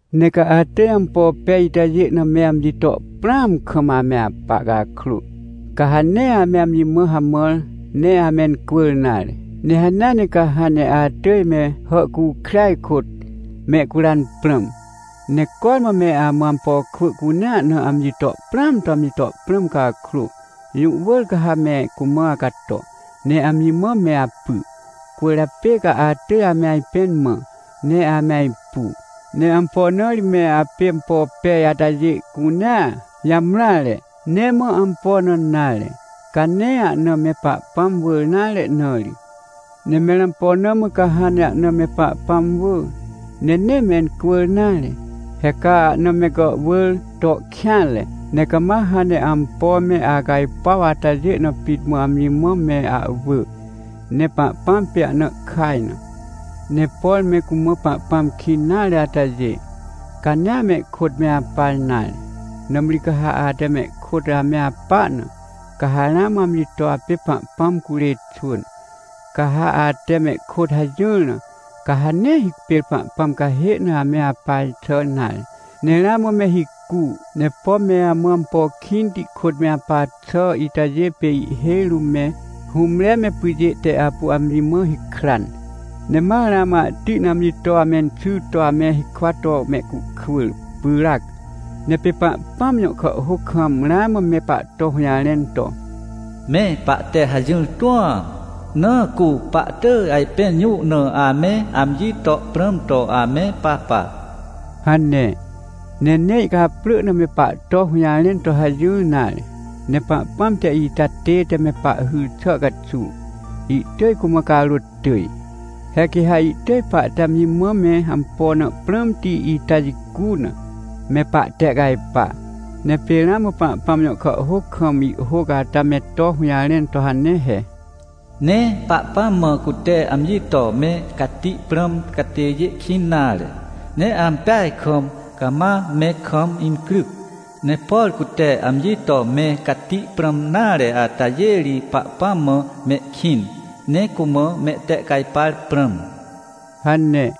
Ne ca atỳj ampo pej itajê na me amji to prãam kam ame apa cakrô, ca ha nee ame amji mã hamãr ne amencwỳr nare. Ne hanea ne ca hãn ne atỳj me hàhcukrêaj kôt mehcuran prãm. Ne cormã me amã ampo kwỳ cunea na amji to prãam to amji to prãm cakrô, jũ wỳr ca ha me cumã acato ne amji mã me apy. Cwỳrjapê ca atỳj ame ajpẽn mã, ne ame ajpu. Ne ampo na ri me apê ampo pej atajê cunea jamreare? Nee mã ampo na nare, ca nee ahna me Pahpãm wỳr nare na ri. Ne mẽr ampo na mã ca hãn ne ahna me Pahpãm wỳ, ne nee mencwỳr nare? He ca ahna me gàhwỳr to kêanre, ne cama hãn ne ampo me acajpuaw atajê na pit mã amji mã me ahwỳ. Ne Pahpãm pê ahna ihkaj na. Ne por me cumã Pahpãm kĩn nare atajê, ca nee amehkôt me apa nare. Nãmri ca ha ate mehkôt ame apa na, ca ha ramã amji to apê Pahpãm curê xwỳn. Ca ha ate mehkôt hajỹr na, ca ha nee hipêr Pahpãm cahê na ame apa xà nare, ne ramã me hicu. Ne pom me amã ampo kĩnti kôt me apa xà itajê pê ihhêj rũm me hũmre me pyjê te apu amji mã hikran, ne ma ramã ahti na amji to amenxy to ame hikwa to mehcuhkwỳr pyràc. Ne pê Pahpãm jõ kàhhôc kam ramã me pahto hũjarẽn to: “Me pahte hajỹr tũam, na cu pahtỳj ajpẽn jũ na ame amji to prãm to ame papa” hane. Ne nee ihcaprỳ na me pahto hũjarẽn to hajỹr nare. Ne Pahpãm te ita tête me pahhyr xà caxuw, ihtỳj cumã carôt tỳj. He quê ha ihtỳj pahte amji mã me ampo na prãmti ita jicu na, me pahtehcajpa. Ne pê ramã Pahpãm jõ kàhhôc kam ihhôc ata me to hũjarẽn to hane he: “Nee Pahpãm mã cute amji to me cati prãm catêjê kĩn nare, ne ampeaj kam cama me kam incryc. Ne por cute amji to me cati prãm nare atajê ri Pahpãm mã mehkĩn, ne cumã mehtehcajpar prãm” hane.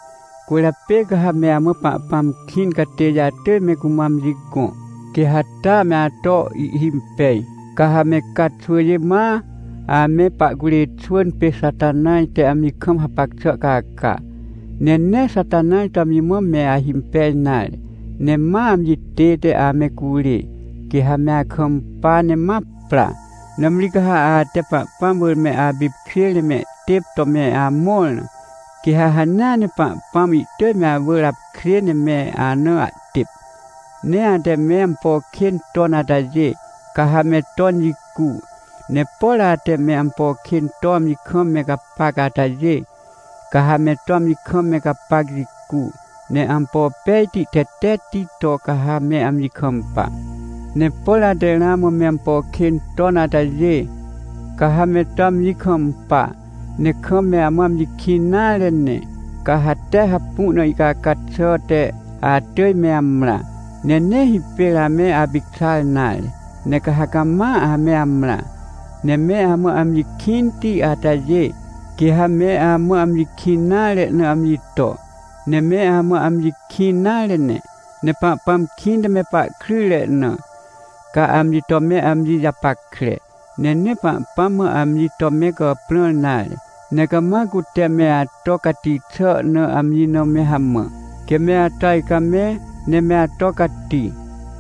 Cwỳrjapê ca ha me amã Pahpãm kĩn catêjê atỳj me cumã amji gõ, quê ha taa me ato ihhimpej. Ca ha me ca xwỳjê ma ame pahcurê xwỳn pê Xatanaj te amji kam hapac xà caca, ne nee Xatanaj to amji mã me ahimpej nare, ne ma amji tête ame curê, quê ha me akampa ne ma pra. Nãmri ca ha ate Pahpãm wỳr me apipkjêr ne mehtêp to me amõr na, quê ha hanea ne Pahpãm ihtỳj me awỳr apkjê ne me ana ahtêp. Ne ate me ampo kên ton atajê, ca ha me ton jicu. Ne por ate me ampo kên to amji kam me gapac atajê, ca ha me to amji kam me gapac jicu, ne ampo pejti, tetetti to ca ha me amji kampa. Ne por ate ramã me ampo kên ton atajê, ca ha me to amji kampa, ne kam me amã amji kĩn nare ne, ca ha tee hapu na ihcaca xà te atỳj me amrã. Ne nee hipêr ame apicxar nare, ne ca ha cama ame amrã. Ne me amã amji kĩnti atajê, quê ha me amã amji kĩn nare na amji to, ne me amã amji kĩn nare ne. Ne Pahpãm kĩnte me pahkryjre na, ca amji to me amji japackre. Ne nee Pahpãm mã amji to me gàprãr nare, ne cama cute me ato cati xà na amji na me hamã, quê me ato ajcamẽ, ne me ato cati.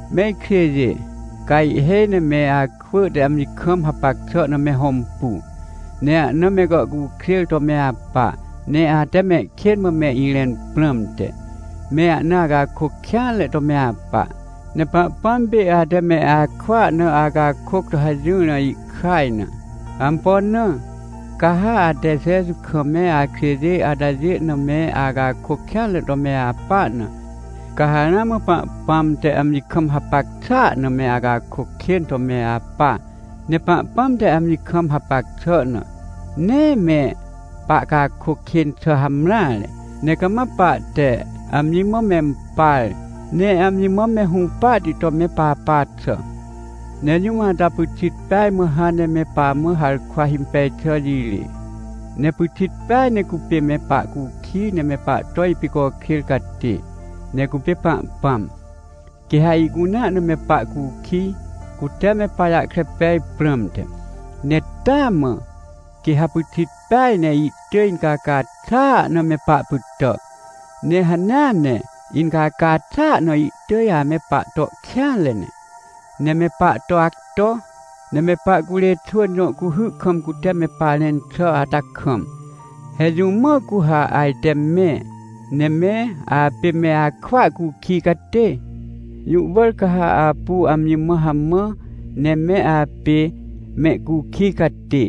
Me ikjêjê, ca ihhêj ne me akwỳ te amji kam hapac xà na me hõmpu, ne ahna me gàhcukjêr to me apa, ne ate mehkên mã me irẽn prãmte, me ahna acakôc kêanre to me apa. Ne Pahpãm pê ate me akwỳa na acakôc to hajỹr na ihkaj na. Ampo na? Ca ha ate Jeju kam me akjêjê atajê na me acakôc kêanre to me apa na, ca ha ramã Pahpãm te amji kam hapac xàa na me acakôc kên to me apa. Ne Pahpãm te amji kam hapac xà na, nee me pahcakôc kên xà hamreare, ne cama pahte amji mã mempar, ne amji mã me hũpahti to me papa xà. Ne jũm ata pyxit peaj mã hãn ne me pamã harkwa himpej xà jirê, ne pyxit peaj ne cupê me pahcukij ne me pahto ipicokjêr catê, ne cupê Pahpãm. Quê ha ihcunea na me pahcukij, cute me pajahkre pej prãmte. Ne taa mã quê ha pyxit peaj ne ihtỳj incaca xàa na me pahpytà. Ne hanea ne incaca xàa na ihtỳj ame pahto kêanre ne, ne me pahto acto. Ne me pahcurê xwỳn jõ cuhy kam cute me parẽn xà ata kam, he jũ mã cu ha ajte me, ne me apê me akwỳa cukij catê? Jũ wỳr ca ha apu amji mã hamã ne me apê mehcukij catê,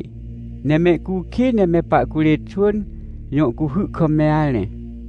ne mehcukij ne me pahcurê xwỳn jõ cuhy kam me arẽ.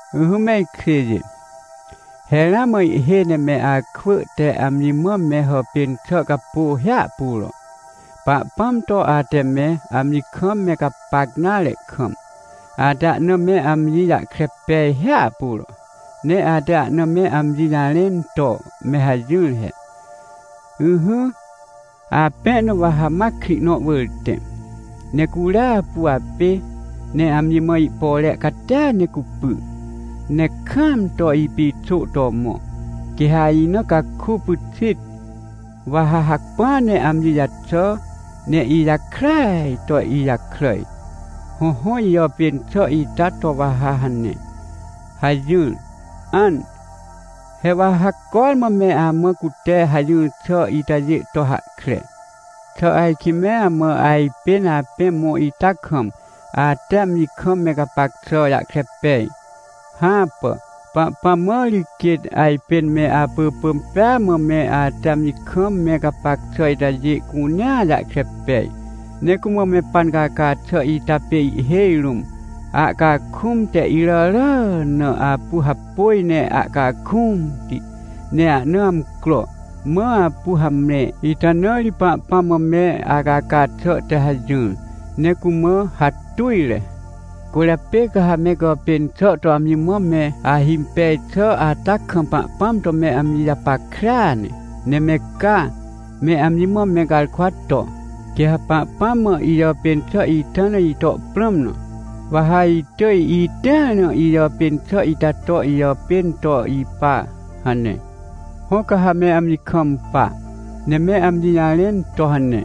Ỹhỹ me ikjêjê, he ramã ihhêj ne me akwỳ te amji mã me hàpên xà capô hiahpuro. Pahpãm to ate me amji kam me gapac nare kam, ate ahna me amji jahkre pej hiahpuro, ne ate ahna me amji jarẽn to me hajỹr he: — Ỹhỹ, apẽ na wa ha ma krĩ nõ wỳr tẽ, ne curia apu apê, ne amji mã ihpore catia ne cupy, ne kaam to ipixô to mõ. Quê ha ina caku pyxit, wa ha hacpỹa ne amji jaxà ne ijakràaj to ijakràj. Hõhõ, ijàpên xà ita to wa ha hane — hajỹr. An! He wa ha cormã me amã cute hajỹr xà itajê to hahkre! Xà ajkĩ me amã ajpên apẽ mõ ita kam, ate amji kam me gapac xà jahkre pej? Hãpà! Pahpãm mã ri quêt ajpên me apỳpỳm pêa mã me ate amji kam me gapac xà itajê cunea jahkre pej. Ne cumã me pancaca xà ita pê ihhêj rũm ahcakũm te iràrà na apu hapôj ne ahcakũmti, ne ahna amcro, mã apu hamre. Ita na ri Pahpãm mã me acaca xà te hajỹr, ne cumã hatujre. Cwỳrjapê ca ha me gàpên xà to amji mã me ahimpej xà ata kam Pahpãm to me amji japackrea ne, ne me ca me amji mã me garkwa to: — Quê ha Pahpãm mã ijàpên xà ita na ito prãm na, wa ha itỳj itĩar na ijàpên xà ita to ijàpên to ipa — hane. Hõ, ca ha me amji kampa, ne me amji jarẽn to hane,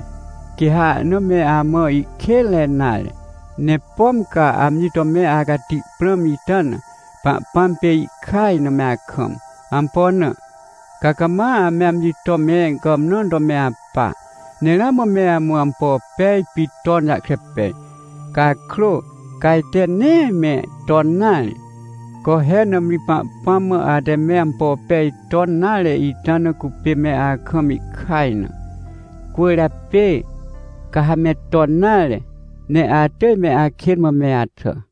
quê ha ahna me amã ihkênre nare. Ne pom ca amji to me acati prãm ita na, Pahpãm pê ihkaj na me akam. Ampo na? Ca cama ame amji to me gàmnãn to me apa. Ne ramã me amã ampo pej pit ton jahkre pej cakrô, ca ajte nee me ton nare. Co he, nãmri Pahpãm mã ate me ampo pej ton nare ita na cupê me akam ihkaj na. Cwỳrjapê ca ha me ton nare, ne atỳj me akên mã me axà.